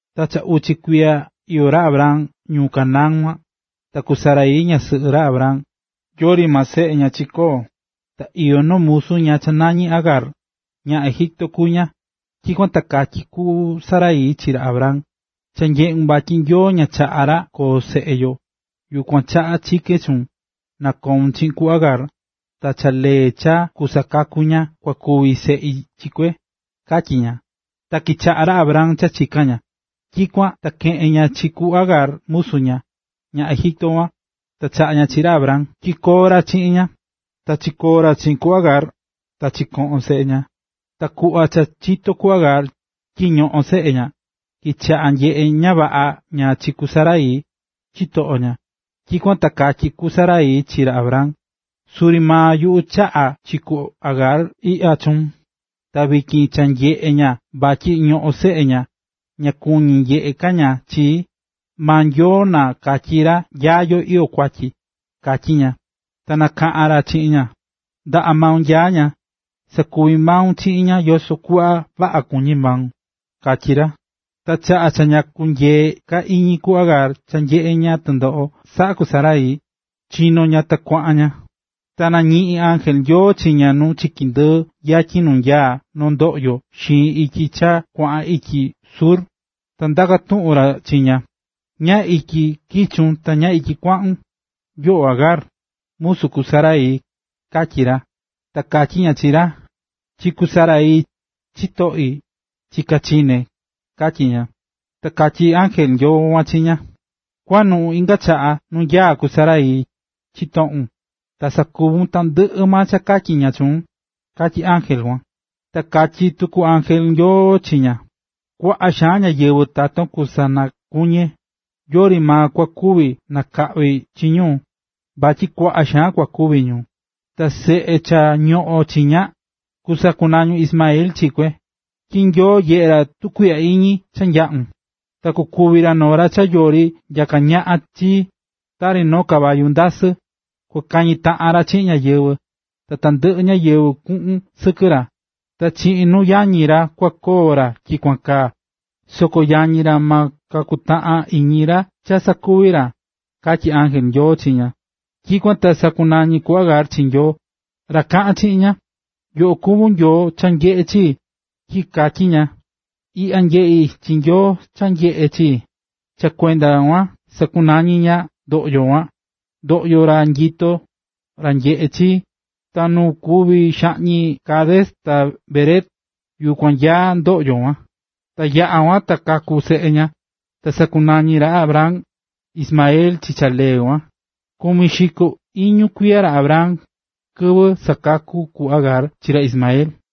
Ta cha uchi kuiya iyó ra Abram ñuꞌún Canaán kuan. Ta ku Sarai, ñasɨꞌɨ ra Abram, yori maa seꞌe ña chikoo̱. Ta iyó noo musu ña cha nañí Agar, ñaꞌan Egipto kuví ña. Tyikuan ta katyí ku Sarai chi ra Abram: ―Cha nyeꞌún vatyi Nyoo ña chaꞌá ra koo seꞌe yo. Yukuan chaꞌa chikén chuun, na koun chiꞌin ku Agar. Ta cha lee cha kusakaku ña kua kuvi seꞌi chi kue ―katyí ña. Ta kichaꞌa̱ ra Abram cha chika̱n ña. Tyikuan ta keꞌe̱n ña chi ku Agar musu ña, ñaꞌan Egipto kuan, ta chaꞌa̱ ña chi ra Abram tyi koo ra chiꞌin ña. Ta chiyo̱ ra chiꞌin ku Agar, ta chikoꞌo̱n seꞌe ña. Ta kuꞌva cha chitó ku Agar tyi ñoꞌón seꞌe ña, kichaꞌa̱ nyeꞌé ña vaꞌa ña chi ku Sarai, chitoꞌo ña. Tyikuan ta katyí ku Sarai chi ra Abram: ―Suri maa yuꞌu chaꞌa̱ chi ku Agar iꞌya chuun, ta vityin cha nyeꞌé ña vatyi ñoꞌón seꞌe ña, ña kuñí nyeꞌé ka ña chii. Maa Nyoo na katyi ra nya yo iyó kuatyi yo―katyí ña. Ta nakaꞌa̱n ra chiꞌin ña: ―Ndaꞌa maun nyaá ña, sa̱kuvi maun chiꞌin ña yoso kuꞌva vaꞌa kuñí maun ―katyí ra. Ta chaꞌa cha ña kunyeé ka iñi ku Agar cha nyeꞌé ña tɨndoꞌo saꞌá ku Sarai, chino̱ ña, ta kuaꞌan ña. Ta nañiꞌi̱n ángel Nyoo chi ña nu chiki ndɨɨ yatyin nu nyaá noo ndoꞌyo xiin ityi cha kuaꞌan ityi Shur. Ta ndaka̱ tuꞌun ra chi ña: ―¿Nyá ityi kichun ta nyá ityi kuaꞌun?, yoꞌo Agar, musu ku Sarai ―katyí ra. Ta katyí ña chi ra: ―Chi ku Sarai, chitoꞌi, chiká chiné ―katyí ña. Ta katyí ángel Nyoo kuan chi ña: ―Kua̱nuꞌun inga chaꞌa nu nyaá ku Sarai, chitoꞌun, ta sakuvun tandɨꞌɨ maa cha katyí ña chuun ―katyí ángel kuan. Ta katyí tuku Ángel Nyoo chi ña: “Kuaꞌa xaan ñáyɨvɨ taton kusanakuñe. Yori maa kua kuvi nakaꞌví chi ñu, vatyi kuaꞌa xaan kua kuvi ñu. Ta seꞌun cha ñoꞌón chiña, kusakunañun Ismael chi kue, tyi nyeꞌé Nyoo tukuiꞌya iñi cha yaꞌún. Ta kukuvi ra noo ra cha yori nyaká ñaꞌan chi, tari noo caballua ndasɨ. Kua kañi taꞌan ra chiꞌin ñáyɨvɨ, ta tandɨꞌɨ ñáyɨvɨ kuꞌun sɨkɨ ra. Ta chiꞌin nuu yañi ra kua koo ra tyikuan kaa, soko yañi ra ma kakutaꞌan iñi ra cha sakuví ra”, katyí ángel Nyoo chi ña. Tyikuan ta sakunañi̱ ku Agar chi Nyoo, ra kaꞌa̱n chiꞌin ña: “Yoꞌo kuví Nyoo cha nyeꞌé chii”, tyi katyí ña: “Iꞌya nyeꞌi̱ chi Nyoo cha nyeꞌé chii.” Ta cha kuenda kuan sakunañi̱ ña ndoꞌyo kuan: “Ndoꞌyo ra nyitó, ra nyeꞌé chii.” Ta nu kuví xaꞌñi Cades ta Bered, yukuan nyaá ndoꞌyo kuan. Ta yaꞌa̱ kuan ta kaku̱ seꞌe ña, ta sakunañi̱ ra Abram, Ismael chi cha lee kuan. Kumi xiko iñu kuiya ra Abram, kɨvɨ sakaku̱ ku Agar chi ra Ismael.